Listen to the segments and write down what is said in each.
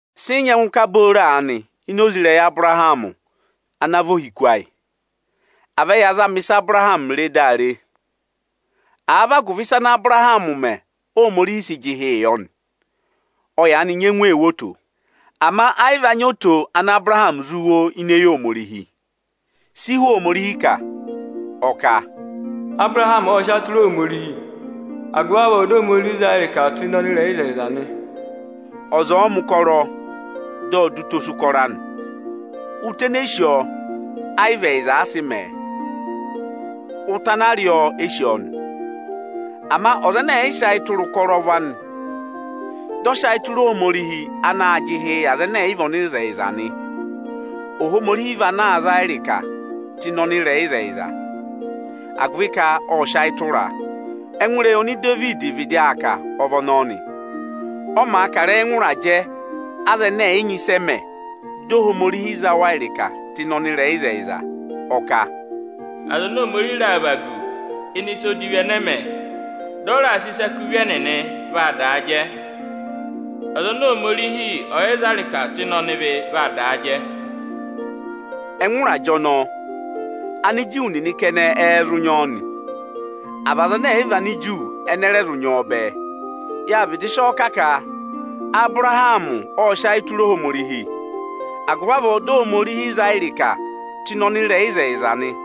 Sị ị nyẹngụ ka booro aanị ini oze ịrẹyị Abụrahamị ana vị ohiku ayị? À vẹ ya zama ịsị Abụrahamị re daa re! Àa vị agụvị ịsa ana Abụrahamị mẹ̀ Óhomorihi sị jị ịhị yọ nị, ọ yaanị nyẹngụ ee wo oto. Ama ẹ yị va nyị oto ana Abụrahamị zụ wo ini eyi Ohomorihi. Si Iwe Ohomorihi kà? Ọ kà, Abụrahamị ọ́ sị ayị tụra Ohomorihi, agụvị avọọ dị Ohomorihi za a ịrịka tụ́ ịnị ọnịrẹyịzẹyịza nị. Ọza ọ̀ọ mẹ̀ ụkọrọ dị ọ dọ utosi ụkọrọ anị. Ụta ene e sí ọọ, ẹ yị vị ẹyịza a sị mẹ̀ ẹ; ụta ana a rị ọọ e sí ọọ nị. Ama ọza ẹnẹ ẹ̀ yị sị ayị tụra ụkọrọ ụvọ anị, dị ọ sị ayị tụra Ohomorihi anaā jị ịhị yị aza ẹnẹ ẹ̀ yị vị ọnịrẹyịzẹyịza nị, Ohomorihi vaa za a ịrịkaa tụ ịnị ọnịrẹyịzẹyịza, agụvị ka ộ sị ayị tụra a. Ẹngụ ịrẹyị ọnị Idevidi vịdị aa kà ọ vị ọnọọ nị, ọ maa kà ịrẹyị ẹngụ ịrajẹ aza ẹnẹ ẹ̀ yị nyị ịsị ẹ mẹ̀ di Ohomorihi za wa ịrịka tụ́ ịnị ọnịrẹyịzẹyịza. Ọ kà, Aza oni Ohomorihi raà vagu ịnị ịsa odivi ẹnẹ ẹ mẹ, dị ọ raà sị ịsa kú ịvị ẹnịnị, vaa daa jẹ. Aza oni Ohomorihi ọ̀ yị za ịrịka tụ́ ịnị ọnịvị vaa daa jẹ. Ẹngụ ịrajẹ ọnọọ, Aniju nịnị kẹnẹ ẹ́ẹ́ zụ nyị ọọ nị, à vị aza ẹnẹ ẹ̀ yị vị Aniju ẹnị ẹ rẹ zụ nyị ọọ bẹẹ? Yâ vịdị sị ọ kà ka Abụrahamị ộ sị ayị tụra Ohomorihi, agụvị avọọ di Ohomorihi za a ịrịka tụ́ ịnị ọnịrẹyịzẹyịza nị.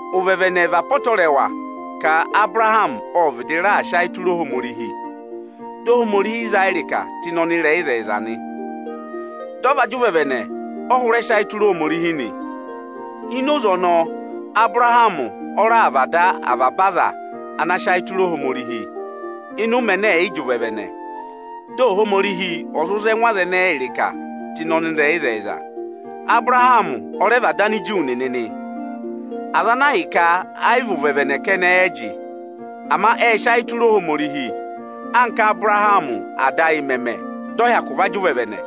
Ụvẹvẹnẹ vị apọtẹrẹwa ka Abụrahamị ộ vịdị raà sị ayị tụra Ohomorihi, di Ohomorihi za a ịrịka tụ́ ịnị ọnịrẹyịzẹyịza nị. Dị ọ va jị ụvẹvẹnẹ ọ hụrẹ sị ayị tụra Ohomorihi nị. Ini oze ọnọọ, Abụrahamị ọ raà vị ada avaba aza ana sị ayị tụra Ohomorihi ịnị ụmẹ ẹnẹ ẹ̀ yị jị ụvẹvẹnẹ, dị Ohomorihi ọ̀ zụ za ẹngụ aza ẹnẹẹ ịrịka tụ́ ịnị ọnịrẹyịzẹyịza. Abụrahamị ọ rẹ vị ada Aniju nịnị nị, aza ana ahịka ẹ yị vị ụvẹvẹnẹ kẹnẹ ẹ jị, ama ệ sị ayị tụra Ohomorihi, anka Ábụrahamị ada ayị mẹẹ̄ mẹ, dị ọ hyakụ va jị ụvẹvẹnẹ.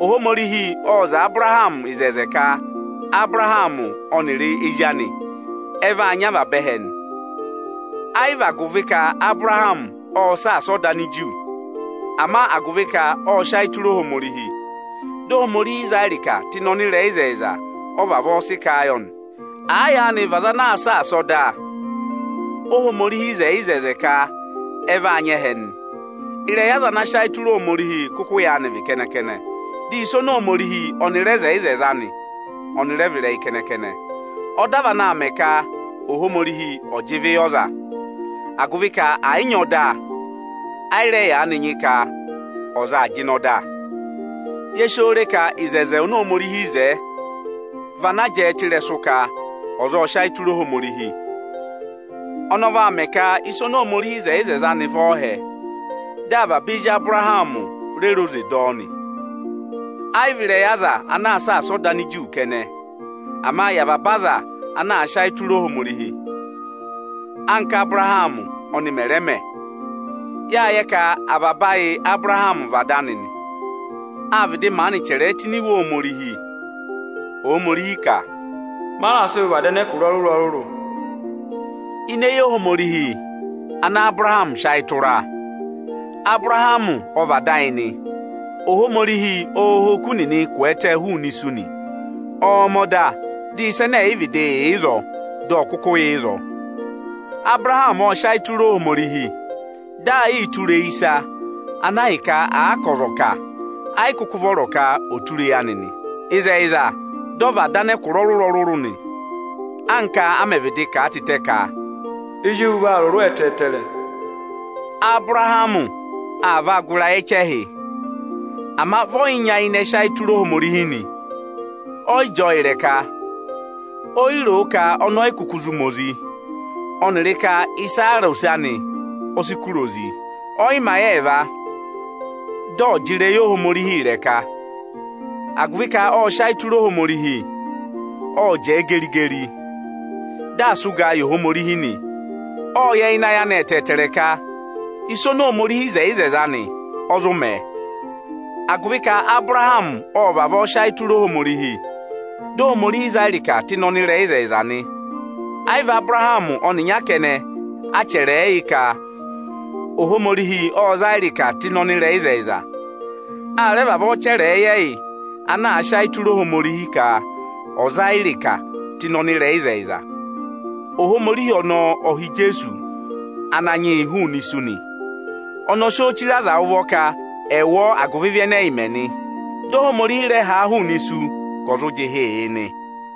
Ohomorihi ộ zẹẹ Abụrahamị ịzẹzẹ ka Abụrahamị ọnịrị ezi anị ẹ vaa nyị avaba ẹhẹ nị. Ẹ yị vị agụvị ka Abụrahamị ộ saasa ọda Aniju, ama agụvị ka ộ sị ayị tụra Ohomorihi, di Ohomorihi za a ịrịka tụ́ ịnị ọnịrẹyịzẹyịza ọ vavọọ sị kà a yọ nị. Àa yaanị vị ọza anaā saasa ọda, Óhomorihi wo oto ka ẹ vaa nyị ẹhẹ nị, ịrẹyị aza ana sị ayị tụra Ohomorihi kụkụ yaanị vị kẹnẹ-kẹnẹ. Dị ịsa oni Ohomorihi rẹẹ ịzẹzẹ anị ọnị rẹ vị ịrẹyị kẹnẹ-kẹnẹ. Ọda vị anaā mẹ ka Ohomorihi ọ̀ jị ịvị yị ọza; agụvị ka ẹ̀ yị nyị ọda, ẹ yị rẹ yaanị nyị ka ọza aa jịnẹ ọda. Ye si oo re ka oto oni Ohomorihi wo, vị ana jẹẹ tụ́ ịrẹsụ ka ọza ộ sị ayị tụra Ohomorihi. Ọnọọ vaa mẹ ka ịsị Ohomorihi wo oto anị vị ọọhẹ, dị avaba ezi Abụrahamị re re oze dọ ọ nị. Ẹ yị vị ịrẹyị aza ana aa saasa ọda Aniju kẹnẹ, ama yị avaba aza ana aa sị ayị tụra Ohomorihi, anka Abụrahamị ọnị mẹ̀ rẹ mẹ. Yâ yẹ ka avaba ayị Ábụrahamị vị ada anị nị. Â vịdị maanị chẹrẹ ẹ tụ́ ini Iwe Ohomorihi. (Ohomorihi ka): Ọnị ọ raà sị Abụrahamị vị ada ẹkụra ọrụrụ-ọrụrụ. Ini eyi Ohomorihi ana Abụrahamị sị ayị tụra Abụrahamị ọ vị ada ayị nị. Ohomorihi ọọ̄ ha oku nịnị ị kwẹẹtẹ hụụnị isu nị; ọọ̄ mẹ̀ ọda dị ịsa ẹnẹ ẹ̀ yị vịdị yà ịzọọ, dị ọ kụkụ yà ịzọọ. Abụrahamị ộ sị ayị tụra Ohomorihi, dị aa yịị tụra eyi ịsa ana ahịka àa ka ọza ọ̀ kà, ẹ yị kụkụ vọrọ ka ọ̀ọ tụra eyi anị nị. Ịzẹyịza, dị ọ vị ada anẹkụra ọrụrụ-ọrụrụ nị, anka a mẹ̀ vịdị kà a tịtẹ ka: Ezi ewu vaa rụrụ ẹtẹẹtẹrẹ. Abụrahamị aa vaa gụ ịrayị ẹchẹhị, ama vị ọ yị nyayịnẹ sị ayị tụra Ohomorihi nị, ọ yị jị ọọ ịrẹka. O yi ro o ka ọnị ọ yị kụkụ zụ ma ozi, ọnịrị ka Isera ose anị ọ sị kụ̀rà ozi. Ọ yị mẹ ayị ẹẹva, dị ọ̀ọ jị ịrẹyị Ohomorihi ịrẹka. Agụvị ka ộ sị ayị tụra Ohomorihi, ộ jẹẹ geri-geri, dị aa sị ụgaa yị Ohomorihi nị. Ộ yẹ ịnị ayị anị ẹtẹẹtẹrẹ ka ịsa oni Ohomorihi wo oto anị, ọ zụ mẹ̀ ẹ. Agụvị ka Abụrahamị ộ vavọọ sị ayị tụra Ohomorihi, dị Ohomorihi za a ịrịka tụ́ ịnị ọnịrẹyịzẹyịza nị. Ẹ yị vị Abụrahamị ọnịnya kẹnẹ, a chẹrẹ ẹ yị ka Ohomorihi ọ za ịrịka tụ́ ịnị ọnịrẹyịzẹyịza. A rẹ vavọọ chẹrẹ ẹ yị ẹyị ana sị ayị tụra Ohomorihi ka ộ za yị ịrịka tụ́ ịnị ọnịrẹyịzẹyịza. Ohomorihi ọnọọ ọ ha Ijeesu Ananyị yị hụụnị isu nị. Ọnị ọ sị ọọ chire aza ụvọ ka ẹ̀ wụ ọọ agụvị ịvị ẹnẹ ẹyị mẹ nị. Dị Ohomorihi rẹ ha a hụụnị isu ka ọ̀ zụ jị ịhị yị nị.